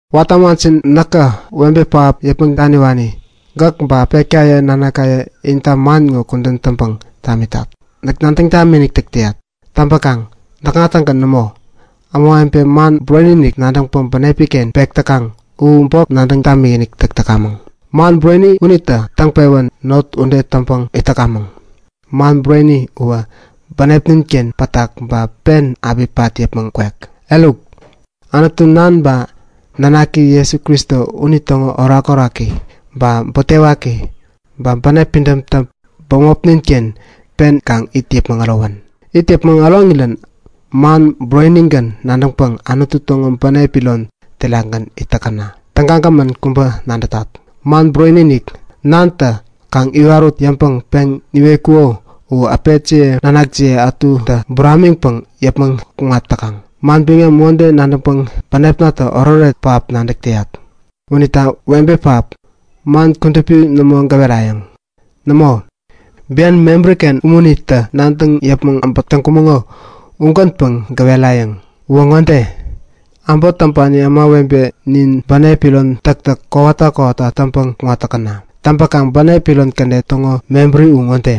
Watä ämajin näkä webe pähap yäpmäŋ daniwani gäk ba äpetkaye nanakaye inta man ŋo kudän täŋpäŋ tamitat. Näk nadäŋ tamikinik täk täyat. Täŋpäkaŋ näkŋagän nämo. Ämawebe man bureni-inik nadäŋpäŋ bänepi-ken pek täkaŋ u bok nadäŋ tamikinik täk täkamäŋ. Man bureni unitä täŋpewän not ude täŋpäŋ itkamäŋ. Man bureni uwä bänepnin-ken pätak ba pen api pat yäpmäŋ kwek. Eruk, Anutu Nan ba nanaki Jesu Kristo unitäŋo orakoraki ba butewaki ba bänep pidämtä bämopnin-ken pen kaŋ it yäpmäŋ ärowän. It yäpmäŋ äroŋirän man burenigän nadäŋpäŋ Anutu täŋo bänep iron terakgän it täkäna. Tägagämän kubä nadätat! Man bureni-inik Nantä kaŋ iwarut yäŋpäŋ peŋ niwetkuko u äpetjiye nanakjiye ätutä buramiŋpäŋ yäpmäŋ kuŋat täkaŋ. Manbiŋam ude nadäŋpäŋ bänepnatä oretoret pähap nadäk täyat. Unita webe pähap, man kudupi nämo gäwerayäŋ. Nämo, bian mebäri-ken umunitä nadäŋ yäpmäŋ äbäk täŋkumäŋo ugänpäŋ gäwerayäŋ. Uwä ŋode; Äbot täŋpani ämawebe nin bänep iron täktäk kowata kowata täŋpäŋ kuŋat täkäna. Täŋpäkaŋ bänep iron kädet täŋo mebäri u ŋode;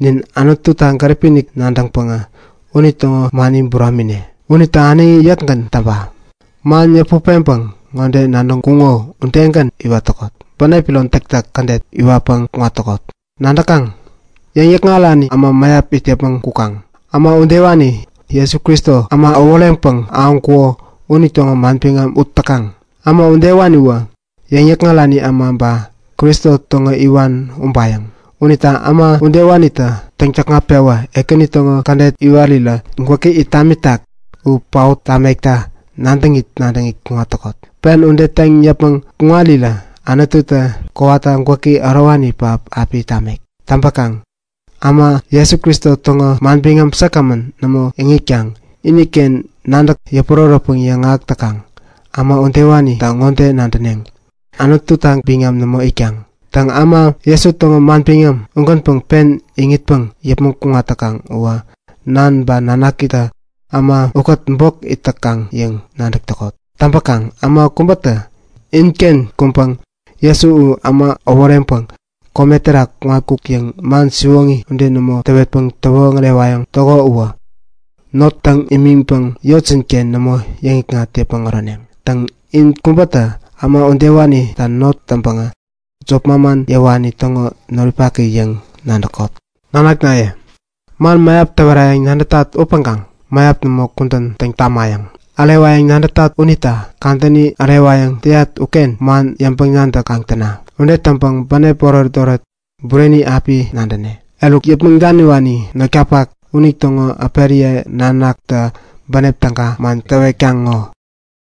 Nin Anututa gäripi-inik nadäŋpäŋä unitäŋo mani buramine. Unita äneŋi yäkgän täŋpa; Man yäput peŋpäŋ ŋode nadäŋkuŋo udegän iwat täkot; Bänep iron täktäk kädet iwatpäŋ kuŋat täkot. Nadäkaŋ? Yäŋ-yäkŋarani äma mäyap it yäpmäŋ kukaŋ. Äma udewani Jesu Kristo äma äworeŋpäŋ ahäŋkuko unitäŋo manbiŋam ut täkaŋ. Äma udewaniwä yäŋ-yäkŋarani äma ba Kristo täŋo iwan ubayäŋ. Unita äma udewanitä täŋ-täkŋat-pewä Ekäni täŋo kädet iwatpäŋ gwäki yäpmäkta piäni täk täŋkuŋo u paot tamekta nadäŋit nadäŋit kuŋat täkot. Pen ude täŋ yäpmäŋ kuŋarirä Anututä kowata gwäki ärowani pähap api tamek. Täŋpäkaŋ äma Jesu Kristo täŋo manbiŋam säkgämän nämo iŋitkaŋ iniken nadäk yäpurärätpäŋ yäŋahäk täkaŋ, äma udewanita ŋode nadäneŋ; Anututa biŋam nämo itkaŋ. Täŋ, äma Jesu täŋo manbiŋam ugänpäŋ pen iŋitpäŋ yäpmäŋ kuŋat täkaŋ uwä Nan ba Nanakitä äma ukät bok it täkaŋ yäŋ nadäk täkot. Täŋpäkaŋ äma kubätä inken kuŋpäŋ Jesu u äma äworeŋpäŋ kome terak kuŋatkuk yäŋ man siwoŋi ude nämo täwetpäŋ täwoŋärewayäŋ täko uwä not täŋ imiŋpäŋ yotjin-ken nämo yäŋikŋat yäpmäŋ äroneŋ. Täŋ, in kubätä äma udewanita not täŋpäŋä jop manman yäwani täŋo noripaki yäŋ nadäkot. Nanaknaye, man mäyap täwerayäŋ nadätat upäŋkaŋ mäyap nämo kudän täŋ tamayäŋ. Ärewayäŋ nadätat unita kadäni ärewayäŋ täyat uken man yäŋpäŋ-nadäk kaŋ täna. Ude täŋpäŋ bänep oretoret bureni api nadäne. Eruk, yäpmäŋ daniwani notkapak unitäŋo äperiye nanaktä bänep täga man täwetkaŋ ŋo. Ugän.